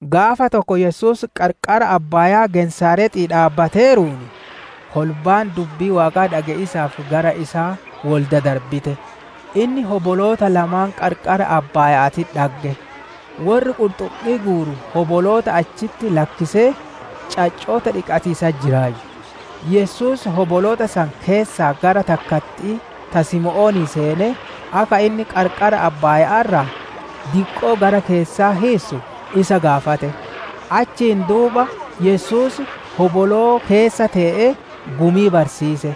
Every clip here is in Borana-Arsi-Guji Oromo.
Gaafa tokko Yesuus qarqara abbaayaa Genesaarexii dhaabbateeruun, kolbaan dubbii Waaqaa dhage'iisaaf gara isaa wol dadarbite. Inni hoboloota lamaan qarqara abbaaya'aatitti dhagge; worri qurxummii guuru hoboloota achitti lakkisee caccoota dhiqatiisatti jiraayyu. Yesuus hoboloota san keessaa gara takkatti'ii, ta Simoonii seenee, akka inni qarqara abbaayaa irraa diqqoo gara keessaa hiissu isa gaafate. Achiin duuba Yesuus hoboloo keessa tee'ee gumii barsiise.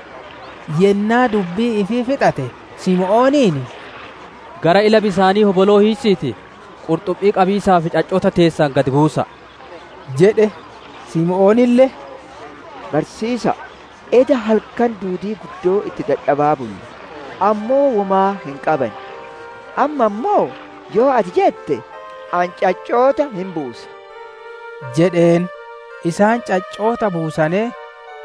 Yennaa dubbii ifii fixate, Simooniin, «Gara ila bisaanii hoboloo hiissiitii, qurxummii qabiisaaf caccoota teessan gad buusa'a» jedhe. Simoonille, «Barsiisa'a, eda halkan duudii guddoo itti dadhabaa bulle, ammoo womaa hin qabanne. Amma ammoo, yoo ati jette ani caccoota hin buusa» jedheen. Isaan caccoota buusanee,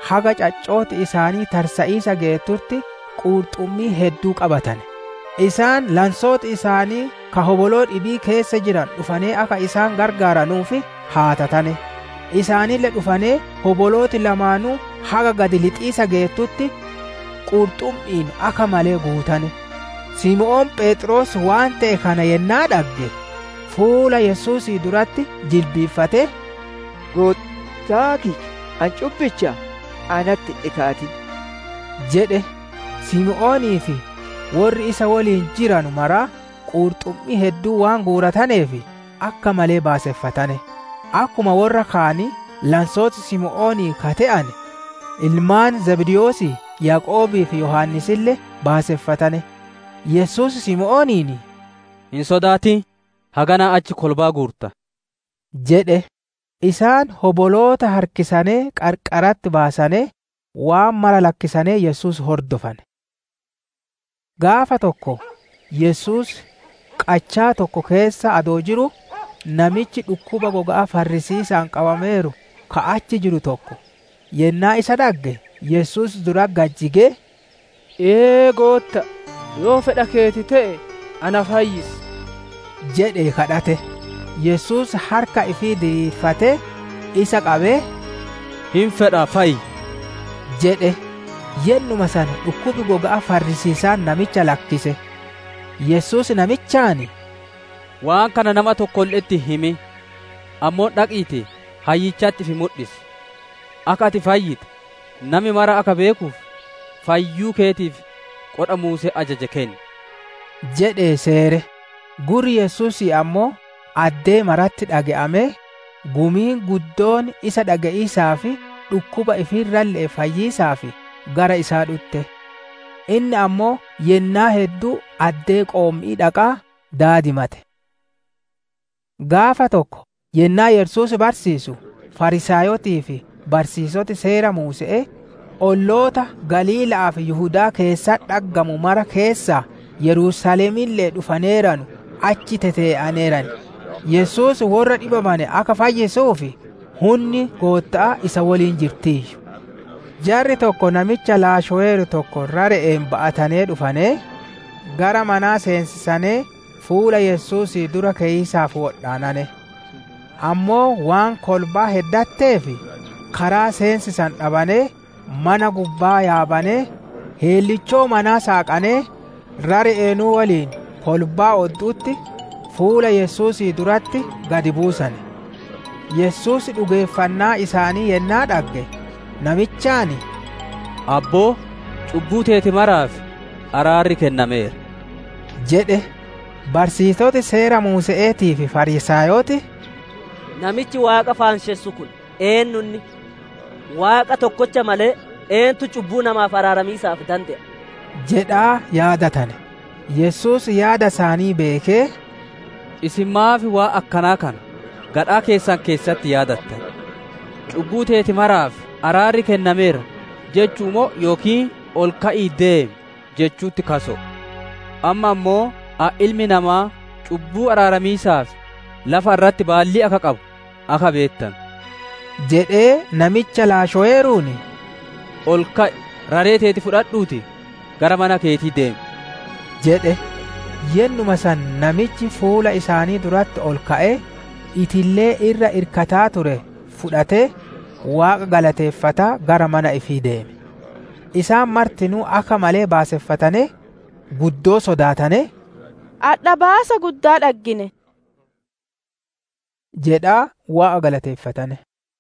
haga caccooti isaanii tarsa'iisa geettutti qurxummii hedduu qabatane. Isaan lansooti isaanii ka hoboloo dhibii keessa jiranu dhufanee akka isaan gargaaranuuf haatatane. Isaanille dhufanee hobolooti lamaanuu haga gad lixiisa geettutti qurxummi'iin akka malee guutane. Simoon Pheexroos waan te'e kana yennaa dhagge, fuula Yesuusii duratti jilbiiffatee, «Goottaa kiyya ani cubbichaa, natti hin dhikaatin!» jedhe. Simoonii fi worri isa woliin jiranu maraa qurxummii hedduu waan guurataneef akka malee baaseffatane. Akkuma worra kaanii, lansoota Simoonii ka te'ane, ilmaan Zabdewoosii Yaaqoobii fi Yohaannisille baaseffatane. Yesuus Simooniin, «Hin sodaatin! Haganaa achi kolbaa guurta» jedhe. Isaan hoboloota harkisanee qarqaratti baasanee, waan mara lakkisanee Yesuus hordofane. Gaafa tokko Yesuus qachaa tokko keessa adoo jiruu, namichi dhukkuba goga'aa farrisiisa'aan qabameeru ka achi jiru tokko, yennaa isa dhagge, Yesuus duratti gad jigee, «Ee Goottaa, yoo fedha keeti te'e na fayyisi» jedhee kadhate. Yesuus harka ifii diriirfatee, isa qabee, «Hin fedha fayyi» jedhe. Yennuma san dhukkubi goga'aa farrisiisaan namicha lakkise. Yesuus namichaan, «Waan kana nama tokkolle'etti hin himin; ammoo dhaqiitii hayyichatti ifi mudhisi; akka ati fayyite, nami mara akka beekuuf, fayyuu keetiif, qodha Muuseen ajaje kenni!» jedhee seere. Gurri Yesuusii ammoo addee maratti dhage'amee, gumiin guddoon isa dhage'iisaa fi dhukkuba ifii irralle'ee fayyiisaaf gara isaa dhutte. Inni ammoo yennaa hedduu addee qoommi'ii dhaqaa daadimate. Gaafa tokko Yennaa Yesuus barsiisu, Fariisaayotii fi barsiisoti Seera Muuse'ee, olloota Galiila'aa fi Yihudaa keessatti dhaggamanu mara keessaa, Yerusaalemille'ee dhufaneeranu achi tetee'aneeran. Yesuus worra dhibamane akka fayyisuuf, hunni Gootta'aa isa woliin jirtiiyyu. Jarri tokko namicha laashoweeru tokko rare'een ba'atanee dhufanee, gara manaa seensisanee fuula Yesuusii dura keyiisaaf wodhaanane. Ammoo waan kolbaan heddatteef, karaa seensisanu dhabanee, mana gubbaa yaabanee, heellichoo manaa saaqanee, rare'eenuu woliin kolbaa oddu'utti, fuula Yesuusii duratti gad buusane. Yesuus dhugeeffannaa isaanii yennaa dhagge, namichaan, «Abboo, cubbuu teeti maraaf araarri kennameera» jedhe. Barsiisoti Seera Muuse'eetii fi Fariisaayoti, «Namichi Waaqa faanshessu kun eennu inni? Waaqa tokkocha malee eentu cubbuu namaaf araaramiisaaf dande'a?» jedhaa yaadatane. Yesuus yaada isaanii beekee, «Isin maaf waan akkanaa kana gadhaa keessan keessatti yaadattan? ‹Cubbuu teeti maraaf araarri kennameera› jechu'u moo yookiin, ‹Ol ka'ii ideem› jechu'utti kaso'o? Amma ammoo ani Ilmi Namaa cubbuu araaramiisaaf lafa irratti baallii akka qabu akka beettanu» jedhee, namicha laashoweeruun, «Ol ka'i! Raree teeti fudhadhuutii gara mana keetii deemi!» jedhe. Yennuma san namichi fuula isaanii duratti ol ka'ee, itillee irra irkataa ture fudhatee, Waaqa galateeffataa gara mana ifii deeme. Isaan martinuu akka malee baaseffatanee, guddoo sodaatanee, «Adha baasa guddaa dhaggine!» jedhaa Waaqa galateeffatane.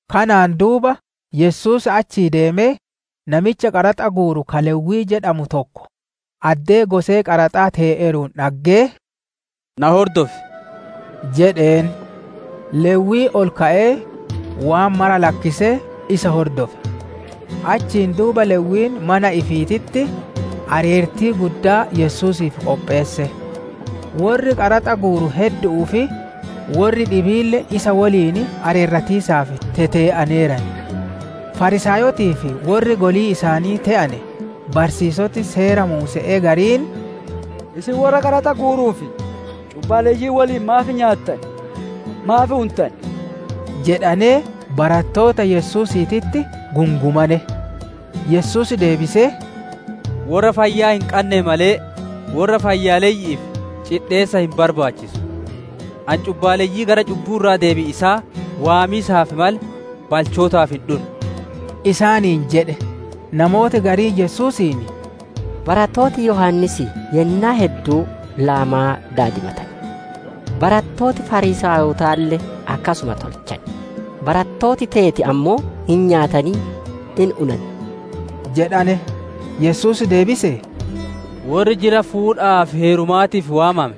Kanaan duuba, Yesuus achii deemee, namicha qaraxa guuru ka Lewwii jedhamu tokko, addee gosee qaraxaa tee'eeruun dhaggee, «Na hordofi» jedheen. Lewwiin ol ka'ee, waan mara lakkisee, isa hordofe. Achiin duuba Lewwiin mana ifiititti, areertii guddoo Yesuusiif qopheesse. Worri qaraxa guuru heddu'uu fi worri dhibiille isaan woliin areeratiisaaf tetee'aneeran. Fariisaayotii fi worri golii isaanii te'ane barsiisoti Seera Muuse'ee gariin, «Isin worra qaraxa guuruu fi cubbaaleyyii woliin maaf nyaattan? Maaf untan?» jedhanee barattoota Yesuusiititti gungumane. Yesuus deebisee, «Worra fayyaa hin qanneef malee, worra fayyaaleyyi'iif cidheessa hin barbaachisu. Ani cubbaaleyyii gara cubbuu irraa deebi'iisaa waamiisaaf malee, balchootaaf hin dhunne» isaaniin jedhe. Namooti gariin Yesuusiin, «Barattooti Yohaannisii yennaa hedduu laamaa daadimatan. Barattooti fariisaayotaalle akkasuma tolchan, barattooti teeti ammoo hin nyaatanii, hin unan» jedhane. Yesuus deebisee, «Worri jila fuudhaa fi heerumaatii waamame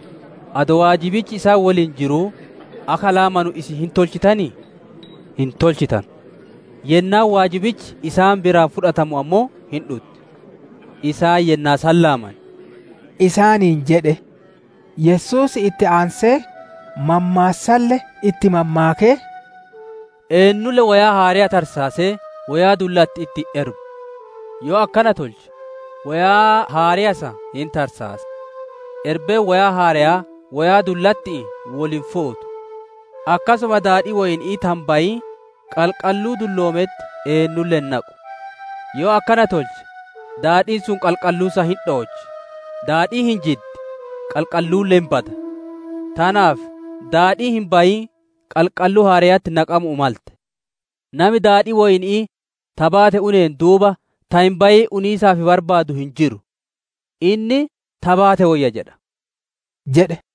adoo waajibichi isaan woliin jiruu, akka laamu isin hin tolchitanii? Hin tolchitanu! Yennaan waajibichi isaan biraa fudhatamu ammoo hin dhutti. Isaan yennaa san laaman» isaaniin jedhe. Yesuus itti aansee, mammaassalle itti mammaakee, «Eennulle woyaa haareya tarsaasee woyaa dullatti'itti hin erbu. Yoo akkana tolche, woyaa haareya san hin tarsaasa. Erbeen woyaa haareyaa woyaa dullatti'iin wol hin fuutu. Akkasuma daadhii woyni'ii ta hin bayiin qalqalluu dulloometti eennulle hin naqu. Yoo akkana tolche, daadhiin sun qalqalluu san hin dhoochi, daadhiin hin jiddi, qalqalluulle hin bada. Tanaaf daadhiin hin bayiin qalqalluu haareyatti naqamu'uu malte! Nami daadhii woyni'ii ta baate uneen duuba ta hin bayiin uniisaaf barbaadu hin jiru. Inni, ‹Ta baate woyya› jedha» jedhe.